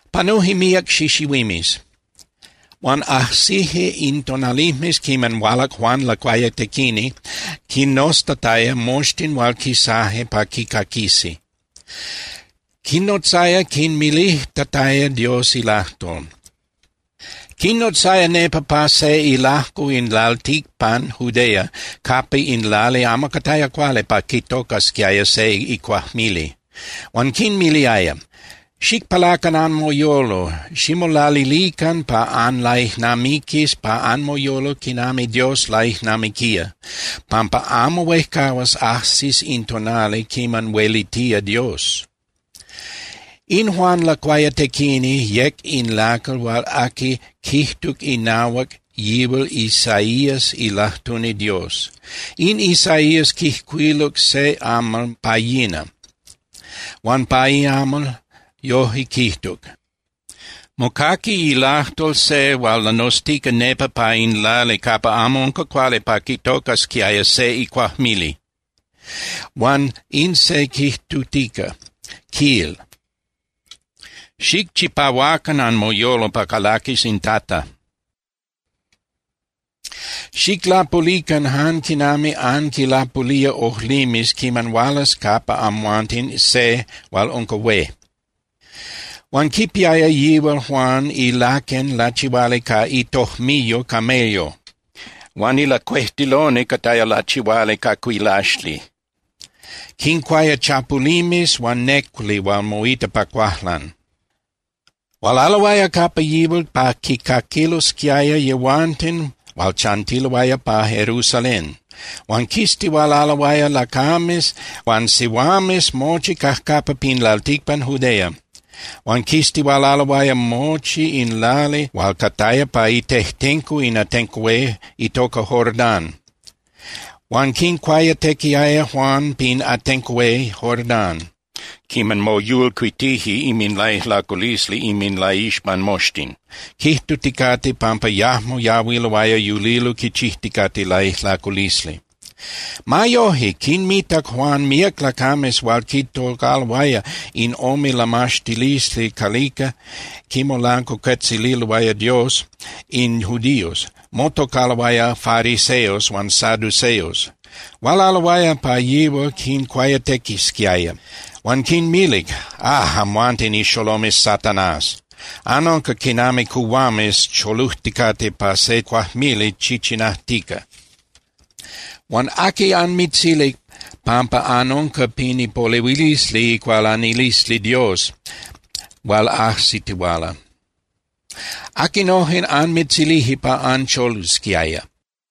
Panuje míac xixihuimes. Huan ajsije in tonalijmes quiman hualac Juan Lacuayatequini quinnoztataya moxtin hual quisaje pa quicaquisi. Quinnotzaya quinmilijtataya Dios ilajtol. Quinnotzaya nepa pa se ilajco in lalticpan Judea capa in lali amo cataya cuali pa quitocasquiaya se icuajmili. Huan quinmiliaya: —Xicpalacan anmoyolo, ximolalilican pa anlaijnamiquis pa anmoyolo quinami Dios laijnamiquía, pampa amo huejcahuas ajsis in tonali quiman huelitía Dios. In Juan Lacuayatequini yec in lacal hual aqui quijtuc inahuac yihual Isaías ilajtuni Dios. In Isaías quijcuiluc se amal pa yina, huan pa iamal yojque quijtuc: Mocaqui ilajtol se hual lanoztica nepa pa in lali capa amo unca cuali pa quitocasquiaya se icuajmili. Huan in se quijtutica, quil: “Xicchipahuacan anmoyolo pa calaquis in Tata, xiclapulican jan quinami anquilapulía ojlimes quiman hualas capa amhuanten se hual unca hué.” Huan quipiaya yihual Juan ilaquen lachihuali ca itojmiyo camello, huan ilacuejtiloni cataya lachihuali ca cuilaxli. Quincuaya chapulimes huan néculi hual moita pa cuajlan. Hualaloaya capa yihual pa quicaquilosquiaya yehuanten hual chantiloaya pa Jerusalén. Huan quistihualaloaya lacames huan sihuames mochi cajcapa pin lalticpan Judea. Huan quistihualaloaya mochi in lali hual cataya pa itejtenco in atenco hué itoca Jordán. Huan quincuayatequiaya Juan pin atenco hué Jordán, quiman moyolcuitije inminlaijlaculisli inminlaixpan moxtin, quijtuticate pampa yajmo yahuiloaya yulilo quichijticate laijlaculisli. Ma yoje, quinmitac Juan míac lacames hual quitocaloaya in ome lamaxtilisli calica quimolancuacuetzililoaya Dios in judíos, motocaloaya fariseos huan saduceos. Hualaloaya pa yihual quincuayatequisquiaya. Huan quinmilic: —¡Ah, amhuanten ixolomes Satanás! Anunca quinami cuhuames cholujticate pa se cuajmili chichinajtica. Huan ¿aqui anmitzilic pampa anunca pin ipolehuilisli icualanilisli Dios hual ajsitihuala? ¿Aquinojen anmitzilije pa ancholusquiaya?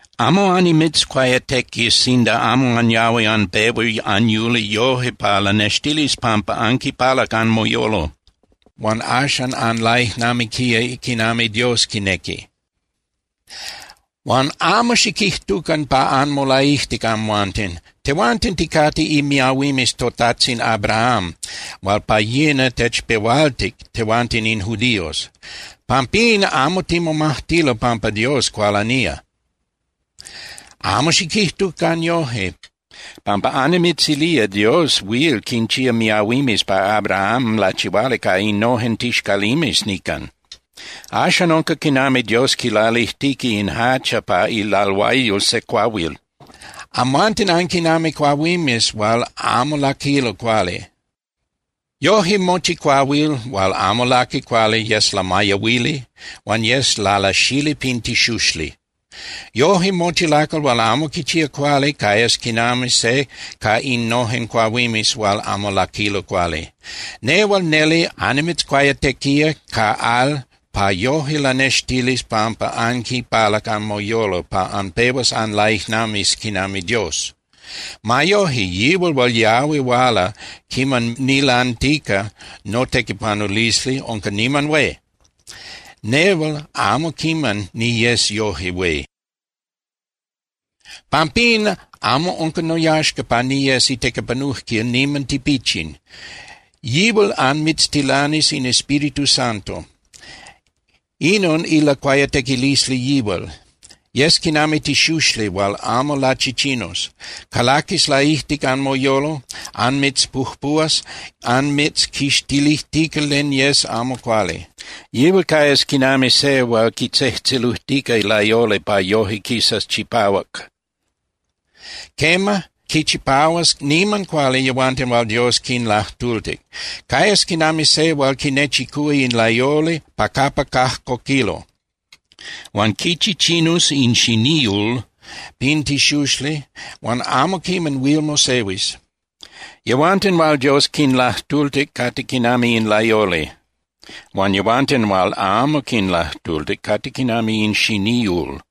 Amo annimitzcuayatequis sinda amo anyahui anpehua anyuli yoje pa lanextilis pampa anquipalac anmoyolo huan axan anlaijnamiquía quinami Dios quinequi. Huan amo xiquijtucan pa anmolaijtic amhuanten: “Tehuanten ticate imiahuimes totajtzin Abraham hual pa yina techpehualtic tehuanten in judíos. Pampín amo timomajtilo pampa Dios cualanía.” Amo xiquijtucan yoje, pampa annimitzilía Dios huil quinchía miahuimes pa Abraham lachihuali ca innojen tixcalimes nican. Axan unca quinami Dios quilalijtica in hacha pa ilalhuayol se cuahuil. Amhuanten anquinami cuahuimes hual amo laquilo cuali. Yoje, mochi cuahuil hual amo laqui cuali yes lamayahuili huan yes lalasali pin tixuxli. Yoje mochi lacal hual amo quichía cuali cayas quinami se ca innojen cuahuimes hual amo laquilo cuali. Nehual neli annimitzcuayatequía ca al pa yoje lanextilis pampa anquinpalac anmoyolo pa anpehuas anlaijnamiquis quinami Dios. Ma yoje, yihual hual yahui huala quiman nilantica notequipanulisli unca niman hué. Nehual amo quiman niyes yoje hué. Pampín amo unca noyaxca pa niyes itequipanujquil niman tipichin. Yihual anmitztilanís in Espíritu Santo. Inon ilacuayatequilisli yihual. Yes quinami tixuxli hual amo lachichinus. Calaquis laijtic anmoyolo, anmitzpujpuhuas anmitzquixtilijtica len yes amo cuali. Yihual cayas quinami se hual quitzejtzelujtica layoli pa yoje quisas chipác. Quema, quichipahuas niman cuali yehuanten hual Dios quinlajtultic. Cayas quinami se hual quinechicúa in layoli pa capa cajcoquilo, huan quichichinus in xiníul pin tixuxli hual amo quiman huil mosehuis. Yehuanten hual Dios quinlajtultic cate quinami in layoli, huan yehuanten hual amo quinlajtultic cate quinami in xiníul.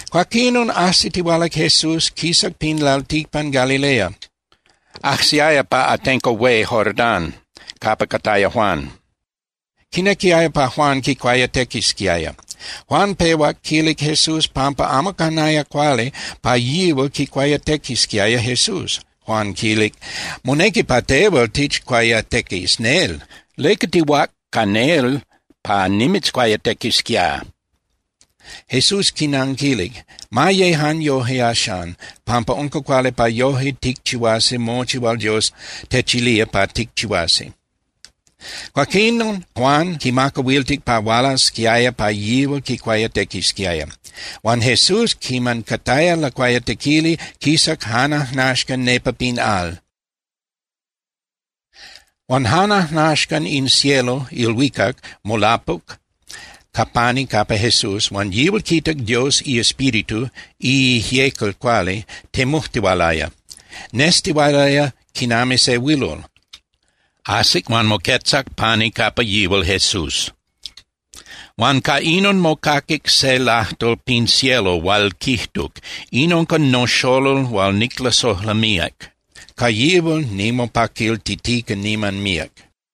Cuaquinon ajsitihualac Jesús, quisac pin lalticpan Galilea. Ajsiaya pa atenco hué Jordán capa cataya Juan. Quinequiaya pa Juan quicuayatequisquiaya. Juan pehuac quilic Jesús pampa amo canaya cuali pa yihual quicuayatequisquiaya Jesús, Juan quilic: —Monequi pa tehual tichcuayatequis nel. ¿Leca tihuác ca nel pa nimitzcuayatequisquiá? Jesús quinanquilic: —Ma ye jan yoje axan, pampa unca cuali pa yoje ticchihuasi mochi hual Dios techilía pa ticchihuasi. Cuaquinon Juan quimacahuiltic pa hualasquiaya pa yihual quicuayatequisquiaya. Huan Jesús, quiman cataya lacuayatequili, quisac jan ajnaxcan nepa pin al. Huan jan ajnaxcan in cielo (ilhuicac) molapuc ca pani capa Jesús huan yihual quitac Dios iEspíritu (iIjyecal Cuali) temujtihualaya. Nestihualaya quinami se huilol. Ajsic huan moquetzac pani capa yihual Jesús. Huan ca inon mocaquic se lajtol pin cielo hual quijtuc: —In unca noxolol hual niclasojla míac. Ca yihual nimopaquiltitica niman míac.